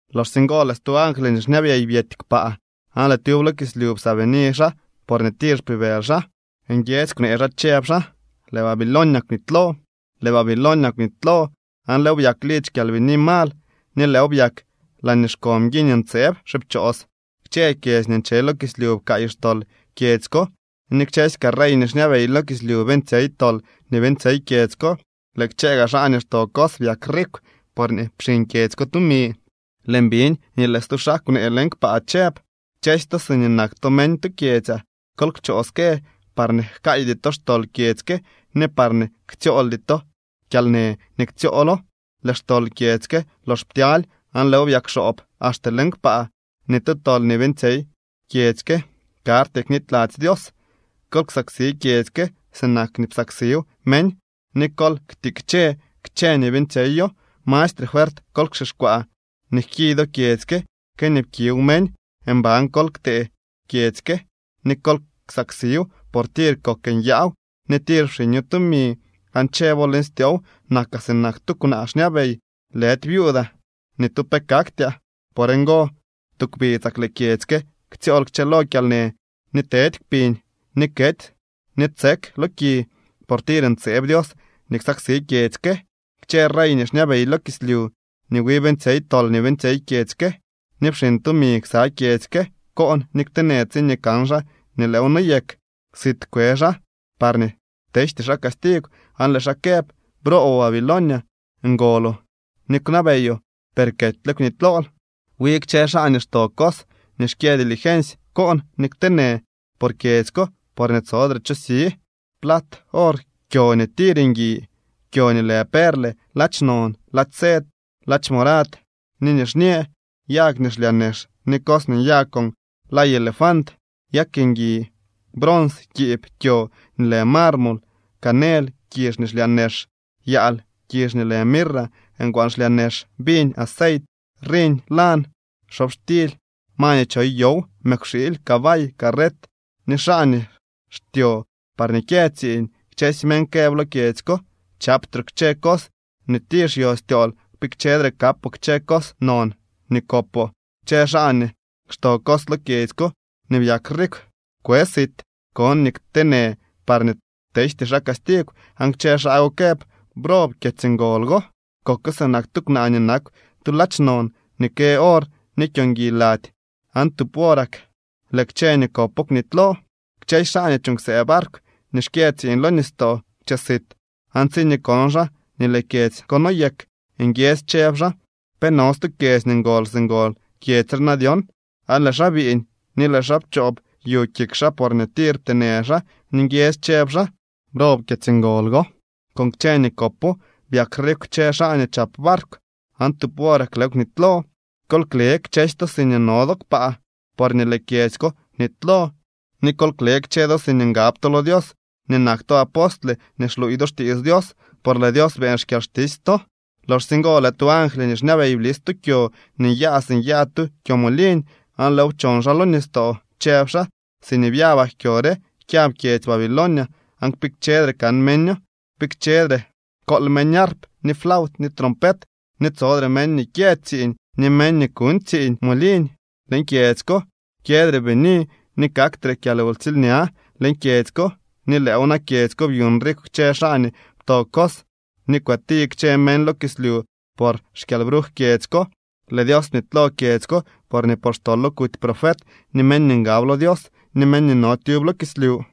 Loxsye ngo lëë stu angly nii xñabey byety kpaa, aan tyub lo kislyu psaabini xaa porñee tir xpibëly xaa. Nguiedzy kwnee xaa, chëb xaa: —Lëë Babilonia kwnitylo, lëë Babilonia kwnitylo, aan lëëw byak lidzy kyalbini mal ni lëëw byak laañee xko mguiñ ntseeb xipchoos. Kchë kyedzy nii nche lo kislyu pkaay xtol kyedzy ko, ni kchësy kaa rey nii xñabey lo kislyu beeñtsyey tol nii beeñtsyey kyedzy ko. Lëë kchë gaa xaa nii xto cos byak rikw porñee pxiñ kyedzy ko tumi. Lëën biñ nii lëë stu xaa kwnee leñ kpaa chëb: —Kchësy to siñee nak to meñ tu kyedzyaa, kol kchoo ske parñee jkaaydy to xtol kyedzy ke ni parñee ktsyooldy to kyalnë nii ktsyoolo. Lëë xtol kyedzy ke lox ptyaly aan lëëw byakxoob axte leñ kpaa, ni tu tol nii beeñtsyey kyedzy ke karty knityladzy Dios. Kol ksaksi kyedzy ke sinak nii psaksiw meñ, ni kol ktikche kchë nii beeñtsyeyo. Mastre fuert kol kxixkwaa nii jki do kyedzy ke que nii pkiw meñ. Mban kol ktee kyedzy ke ni kol ksaksiw, por tir kok nyaaw ni tir pxiño tumi, aan chëbo leñ styoow: “Nakaa sinak tu kwnaa xñabey. Lëdy viuudaa. Ni tu pe kaktyaa.” Por ngo, tu kpidzak lëë kyedzy ke ktsyool kchëlo kyalnë ni tedy kpiñ, ni kety ni tsek lo ki. Por tir ntseeb Dios nii ksaksi kyedzy ke. Kchë rey nii xñabey lo kislyu nii wi beeñtsyey tol nii beeñtsyey kyedzy ke ni pxiñ tumi ksa kyedzy ke koon ni kteenë tsiñee kan xaa nii lëëw noyek. Sit kwe xaa parñee tejty xaa castigw, aan lëë xaa këb: —¡Brooboo, Babilonia! Ngoloo ni kwnabeyoo, per ketyle kwnitylool. Wi kchë xaa nii xto cos ni xkyë dilgensy koon ni kteenë por kyedzy ko, porñee tsodre cho si plat, or, kyo nii tir ngui, kyo nii lë perle, ladx non, ladx sed, ladx morad ni nixñë, yag nii xlyaa nex, ni cos nii nyaa con lay elefant, yag ngui, brons, kiib, kyo nii lë marmol, canel, kizh nii xlyaa nex, yaal, kizh nii lë mirra, ngwaan xlyaa nex, viñ, aceit, riñ lan, xobxtily, ma nii choy yow, mëkwxiily, cabay, carret ni xaa ni xtyo par kyë tsiiñ. Kchësy meñ këb lo kyedzy ko: —¡Chaptroo kchë cos nii tir xyo styool, kpikchedre kapoo kchë cos non nii kopoo! Kchë xaa nii xto cos lo kyedzy ko ni byak rikw kwe sit, koon ni kteenë parñee tejty xaa castigw, aan kchë xaa go këb: —¡Brob kyedzy ngol go! Koko sinak tu kwnaa nii nakw tu ladx non ni kë or ni kyo ngui lady, ¡aan tub worak lëë kchë nii kopo kwnitylo! Kchësy xaa nii chuuñ ksëë barkw ni xkyë tsiiñ lo nistoo kwche sit, aan tsiñee kon xaa nii lëë kyedzy ko noyek, nguiedzy chëb xaa: —¿Pe no stu kyedzy nii ngol si ngol kyedzy re na dyon? Aan lëë xaa biiñ ni lëë xaa pchoob yu kik xaa porñee tir pteenë xaa, ni nguiedzy chëb xaa: —¡Brob kyedzy ngol go! Con kchë nii kopo byak rikw kchë xaa nii chap barkw, ¡aan tub worak lëëw kwnitylo! ’Kol kle kchësy to siñee no do kpaa, porñee lëë kyedzy ko kwnitylo ni kol kle kchë do siñee ngab to lo Dios ni nak to apostle ni xluuy do xtiits Dios, por lëë Dios beeñ xkyalxtisy to. Loxsye ngo lëë tu angly nii xñabey blis tu kyo nii nyaa si nyaa tu kyomoliñ, aan lëëw pchon xaa lo nistoo, chëb xaa: —Siñee byabak kyo re kyab kyedzy Babilonia aan kpikchedre kan meño. Kpikchedre kool meñ arp, ni flaut ni trompet, ni tsodre meñ nii kyë tsiiñ ni meñ nii kuuñ tsiiñ moliñ leñ kyedzy ko. Kyëdre bini ni kaktre kyalwtsiilña leñ kyedzy ko, ni lëëw na kyedzy ko byuñ rikw kchë xaa nii pto cos ni kwëti kchë meñ lo kislyu por xkyalbruj kyedzy ko. Lëë Dios bnitylo kyedzy ko porñee por xtolo kuty profet ni meñ nii ngab lo Dios ni meñ nii no tyub lo kislyu.